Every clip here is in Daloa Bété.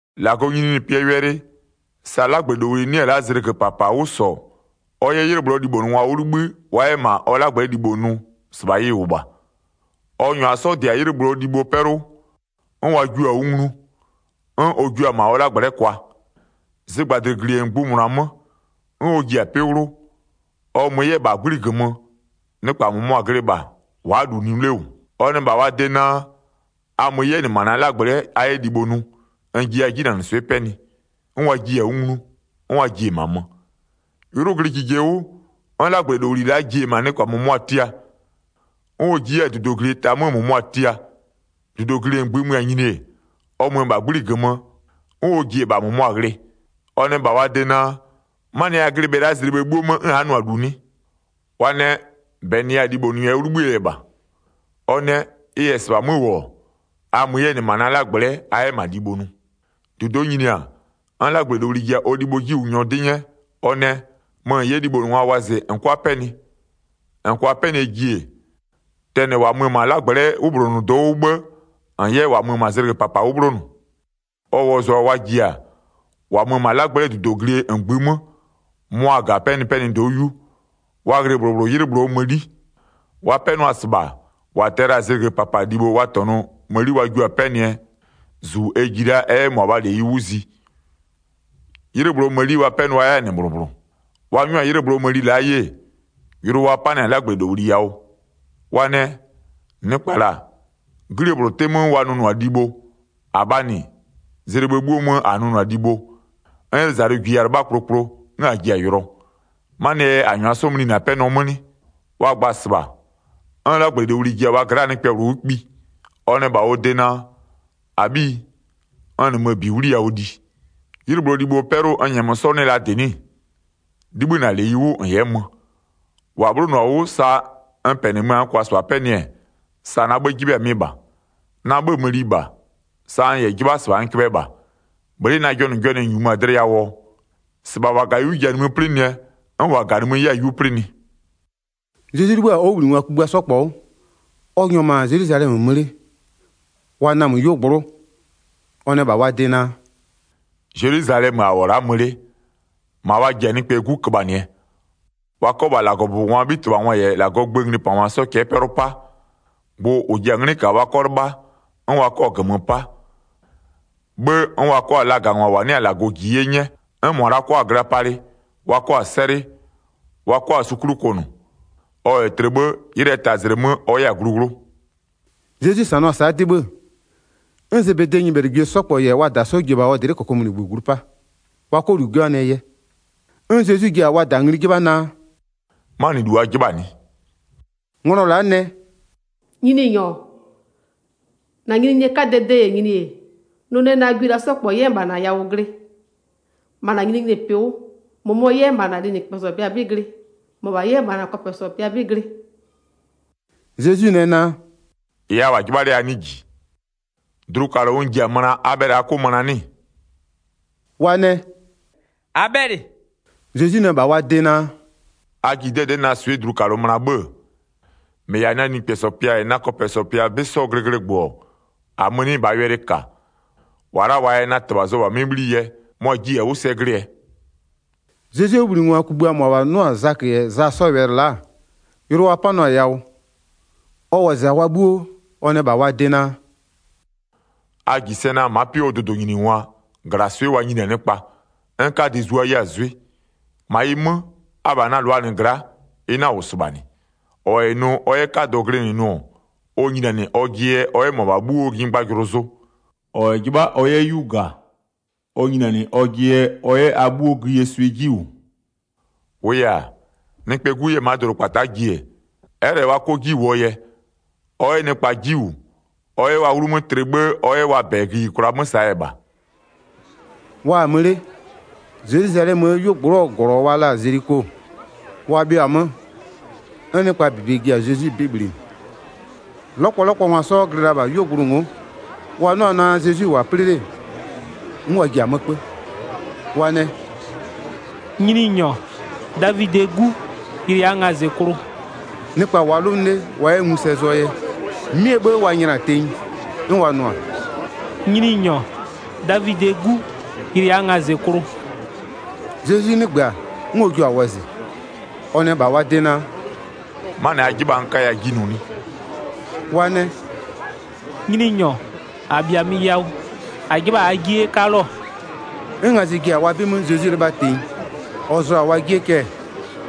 1-Lagɔɔ nyininyinipɩɛ wɛlɩ, sa 'lagblɛlowli 'nɩ-ɛ la'a zlɩgö -papa 'wʋ -sɔ ɔ 'yɛ 'ylɩ -bhlʋɔ libhonʋngwa 'wʋ 'libhï wa 'yɛ -ma ɔ 'lagblɛ'ɛ libho nʋ, -sɩbha ɩ -wʋ -bha. Ɔ -nyʋa 'sɔ -dɩ-a 'ylɩ -bhlʋɔ libhoo 'pɛlʋ, 'n wa jiʋ-a 'wʋ nglu, 'n ɔ jua-a -ma ɔ 'lagblɛ'ɛ kwa. Zɩgbadlɩglie -ngbïmʋna 'mö, 'n ɔ ji-a 'pɩ 'wlʋ. Ɔ mö 'yɛ-ɛ -bha 'gbli -gömö, -mʋmʋa glɩ -bha, wa'a -lu nʋ 'le -wʋ. Ɔ nɛ -bha wa de naa: A mö 'yɛ -nɩ -ma na 'lagblɛ'ɛ a 'yɛ libho nʋ, n jiya 'jinanɩswɩ'ɩ 'pɛnɩ. 'N wa jiɩ-a 'wʋ nglu, 'n wa ji-e -ma mö. 'Ylʋ glɩ jije 'wʋ, 'n 'lagblɛlowli la'a ji-e -ma -mʋmʋa tia. 'N ɔ ji 'yɛ-a -dudoglie ta 'mö -mʋmʋa tia. 6-Dudoglie -ngbï mö-a nyini-e, ɔ mö-ö -bha 'gbli -gömö, 'n ɔ ji-e -bha -mʋmʋa ghlɩ. Ɔ nɛ -bha wa de naa: 'Manɩɛ yɛ a glɩ bhe la'a zlɩ bhë 'bhuo 'mö 'n a'a nʋ-a -lu 'nɩ? Wa nɛ: -Bɛ -nɩya-a libhonʋ yɛ 'wʋ 'libhïë yɛ -bha. Ɔ nɛ: Ɩ -yɛ -sɩbha 'mö -wʋ-ɔ, a mö 'yɛ -nɩ -ma na 'lagblɛ'ɛ a 'yɛ -ma libho nʋ. 8-Dudo'o nyini-a, 'n 'lagblɛlowli ji-a ɔ libhoo 'jiwʋnyɔ 'dɩ 'nyɛ, ɔ nɛ: Mö -n 'yɛ libhonʋngwa wɔzɩ -n 'kʋa 'pɛnɩ. -N -kʋa 'pɛnɩɛ ji-e, tɛnɩ -wa mö-ö -ma 'lagblɛ'ɛ 'wʋbhlonʋdo'o 'wʋ 'bhë -n 'yɛ -wa mö-a zlɩgö -papa 'wʋ 'bhlonʋ. Ɔ wɔzʋa-a wa ji-a, -wa mö-ö -ma 'lagblɛ'ɛ -dudoglie -ngbï 'mö, mʋa-a -ga-a 'pɛnɩpɛnɩdo'o 'yu. Wa ghlɩ -bhlʋ -bhlʋ 'ylɩ -bhlʋɔ mëni. Wa 'pɛnʋa-a -sɩbha, -wa tɛ-ɛ la-a zlɩgö -papa libho wa -tɔnʋ mëni wa jua-a 'pɛnɩɛ -zu ɛ ji la ɛ 'yɛ -mʋabhaa -leyi 'wʋ zi. 'Ylɩ -bhlʋɔ mëni wa 'pɛnʋa 'yɛ-a -nɩ -bhlʋ -bhlʋ. Wa 'nyʋa-a 'ylɩ -bhlʋɔ mëni la'a 'ye, yʋlʋ wa 'panɩ-a 'lagblɛlowli yawʋ. Wa nɛ: Nɩkpa -la, 'glie -bhlʋ 'tɩ 'mö wa nʋnʋ-a libho, -abhaa -nɩ, zlɩ bhë 'bhuo mö -a nʋnʋ-a libho, 'n 'ylʋzalʋ -jiya-a 'lɩbha kplokplo, 'n -a ji-a yʋlɔ. 'Manɩɛ yɛ -a -nyʋa 'sɔ mlinɩ-a 'pɛnɔ 'mö 'nɩ? Wa gba-a -sɩbha, 'n 'lagblɛlowli ji-a wa gla'aa nɩkpɛ -bhlʋ 'wʋ kpi. Ɔ nɛ -bha ɔ de naa: -Abhiyi, n -nɩmö-ö -bi 'wliyawʋ li, 'ylɩ -bhlʋɔ libhoo 'pɛlʋ n -nyɛmö 'sɔ 'nɩ-ɛ la -dɩ 'nɩ-ɩ? 'Libhï -na -leyi 'wʋ -n 'yɛ mö. -Wa 'bhlonʋ-a 'wʋ, sa n -pɛnɩmö-a n -kʋa -sɩbha 'pɛnɩ-ɛ, -ɩ na 'bhë 'jɩbha-a mɩ -bha. Na 'bhëë mëni -bha, sa n -yɛ 'jɩbha -sɩbha n köbhɛ -bha. Bhlɩ'ɩ na jɔnʋjɔnʋɛ-ɛ -nyumö-a dlɩ yawʋɔ? 16-Sɩbha -wa -ga-a 'yu ji-a nimï 'plɩnɩɛ 'n -wa -ga-a nimï 'yɛ-a 'yu 'plɩnɩ.” Zezwi 'libhï-a ɔ 'wʋbhlinɩngwa kugbïa 'sɔ -kpɔ 'wʋ, ɔ -nyʋa-a -ma Zelwizalɛmö mö 'le, wa namö 'yuogblʋ'ʋ, ɔ nɛ -bha wa de naa: “Zelwizalɛmö a -wʋ-ɔ la'a mö 'le, -ma wa ji-a Nɩkpɛɛ 'Gu köbhanɩɛ, wa 'kɔ -bha -Lagɔbʋbɔngwaa 'bhitɩbhangwa -yɛ -Lagɔɔ gböö nglipangwa 'sɔ cɛ'ɛ 'pɛlʋ 'pa. Gbʋ -ʋ ji-a 'nglɩ -kaa wa 'kɔ 'lɩbha, 'n wa 'kɔ-a -gömö 'pa. 'Bhë 'n wa 'kɔ-a lagangwa -wa 'nɩ-a -Lagɔ -ji 'ye 'nyɛ, 'n -mʋa la'a 'kɔ-a gla palɩ, wa 'kɔ-a 'sɛlɩ, wa 'kɔ-a su 'klʋ kʋnʋ. Ɔ -yɛ tlɩ 'bhë, 'ylɩɛ tazlɩ 'mö ɔ 'yɛ-a glu 'wlʋ.” Zezwi -sanʋa-a sa'a dɩ 'bhë, 'n Zebedee nyɩbhɛlɩgwie 'sɔ -kpɔ -yɛ wa -da 'sɔ ji-e -bha ɔ dlɩ'ɩ -kokomunigbö glu 'pa, wa 'kɔ -lu 'jɩbhanɩɛ yɛ. 'N Zezwi ji-a wa -da ngli 'jɩbha naa: “'Manɩlu -n 'jɩbha-a 'nɩ?” Nglɔ la'a nɛ: “Nyininyɔ, -na nyininyinie 'kadɛɛ de -yɛ nyini-e, nʋ nɛ na gwie la'a 'sɔ -kpɔ 'yɛ -bha -na yawʋ glɩ, -ma -na nyininyinipɩ 'wʋ, -mʋmɔ 'yɛ -ma -na linɩkpɛsɔ pɩa 'bɩ glɩ, -mɔbha 'yɛ -ma -na kɔpɛsɔ pɩa 'bɩ glɩ.” Zezwi nɛ naa: “-Ɩ a -wʋ-a 'jɩbha 'le a 'nɩɩ -ji. Dlukalʋ n ji-a möna a bhɛlɩ a 'kʋ möna 'nɩ-ɩ?” Wa nɛ: “-A bhɛlɩ.” Zezwi nɛ -bha wa de naa: “A ji 'dɛdɛ'ɛ na swɩ'ɩ dlukalʋ möna 'bhë-ë, -mɩ -yɛ-a na linɩkpɛsɔ pɩa -yɛ na kɔpɛsɔ pɩa 'bɩ 'sɔɔ sɛglɩgbʋ-ɔ, -amö-ö 'nɩ -bhaa wɛlɩ -ka. -Wa la'a -waa yɛ na -Tɩbha zʋ-ɔ -bha 'mɩ 'bhli yɛ, mʋa-a jiɩ-a 'wʋ sɛ glɩɛ.” Zezwie 'wʋbhlinɩngwa kugbïa -mʋabha 'nʋ-a Zakö -yɛ Za 'sɔɔ wɛlɩ la'a, yʋlʋ wa 'panʋa-a yawʋ. Ɔ wɔzɩ-a wa 'bhuo, ɔ nɛ -bha wa de naa: “A -ji sɛ naa ma'a 'pɩ 'wʋɔ dʋdʋnyiningwa -glaswɩ'ɩ wa nyini-a nɩkpa, 'n 'kadɩ zua 'yɛ-a 'zwɩ. 26-Ma ɩ 'mö, abha na -lʋaa -nɩ gla'a, ɩ 'na-a -wʋ -sɩbha -nɩ. -Ɔ -yɛ nʋ ɔ 'yɛ 'kadɔ glɩnɩ nʋ-ɔ, ɔ nyinianɩ ɔjɩ yɛ ɔ 'yɛ a 'bhuoo nyɩgbajʋlʋ zʋ. 27-Ɔ -yɛ 'jɩbha ɔ 'yɛ 'yu -ga, ɔ nyinianɩ ɔjɩ yɛ ɔ 'yɛ a 'bhuo gïyie swɩ 'ji -wʋ. 28-Wʋʋ yɛ-a, Nɩkpɛɛ 'Gu 'yɛ-ɛ ma'a dʋdʋkpata'a ji-e, ɛ'ɛ -lɛ wa 'kɔ 'ji -wʋɔ yɛ, ɔ 'yɛ nɩkpa 'ji -wʋ, ɔ 'yɛ wa 'wlumö tlɩ 'bhë ɔ 'yɛ wa -bɛ gïyikwla 'mö -saa yɛ -bha.” Wa-a mö 'le, Zelwizalɛmöö 'yuogblʋ'ʋɔ -glɔ wa la-a Zeliko, wa bhɩʋ-a 'mö, 'n nɩkpaa -bebe ji-a Zezwi 'bɩ bhlinɩ. 'Lɔkpɔlɔkpɔngwa 'sɔ glɩ la -bha 'yuogblʋ ngo'o, wa 'nʋ-a naa Zezwi-i -wʋ-a 'plɩ 'le, 'n wa ji-a 'mö 'kpö, wa nɛ: “Nyininyɔ, Davidɩɛ 'Gu, yɩlɩ -aa ngazɩklʋ.” Nɩkpa -wʋʋa 'lʋnʋ 'le wa 'yɛ ngu sɛ zʋɔ yɛ, 'mɩɛ 'bhë wa nyla-a tenyi, 'n wa nʋ-a: “Nyininyɔ, Davidɩɛ 'Gu, yɩlɩ -aa ngazɩklʋ.” Zezwi 'nɩgbö-a, 'n ɔ jua-a wɔzɩ. Ɔ nɛ -bha wa de naa: “'Manɩ a 'jɩbha-a n 'kaya 'ji nʋ 'nɩ?” Wa nɛ: “Nyininyɔ, -a -bhiamö yawʋ, -a 'jɩbha -aa 'jie 'yɛ 'kaluo.” 'N ngazɩ ji-a wa 'bɩ 'mö Zezwi 'lɩbha tenyi. Ɔ zʋ-a wa jie cɛ,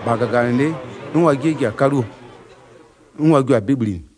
-bha -gaganɩlɩ'ɩ 'n ɩ ji-a 'kaluo. 'N wa jio-a 'bɩ bhlinɩ.